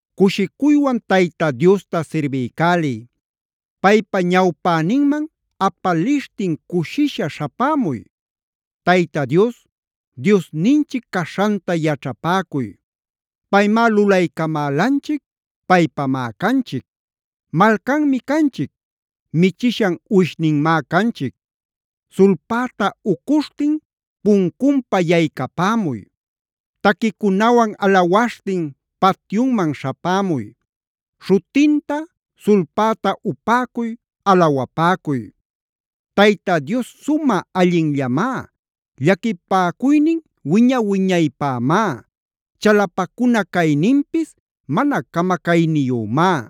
Cushicuywan Tayta Diosta sirbiycäliy. Paypa ñawpäninman apalishtin cushisha śhapämuy. Tayta Dios, Diosninchic caśhanta yaćhapäcuy. Paymá lulaycamälanchic, paypamá canchic. Malcanmi canchic, michishan uwishninmá canchic. Sulpäta ucuśhtin puncunpa yaycapämuy. Taquicunawan alawaśhtin patyunman śhapämuy. ¡Śhutinta, sulpäta upäcuy, alawapäcuy! Tayta Dios sumä allinllamá, llaquipäcuynina wiña-wiñaypämá, chalapacuna cayninpis mana camacayniyümá.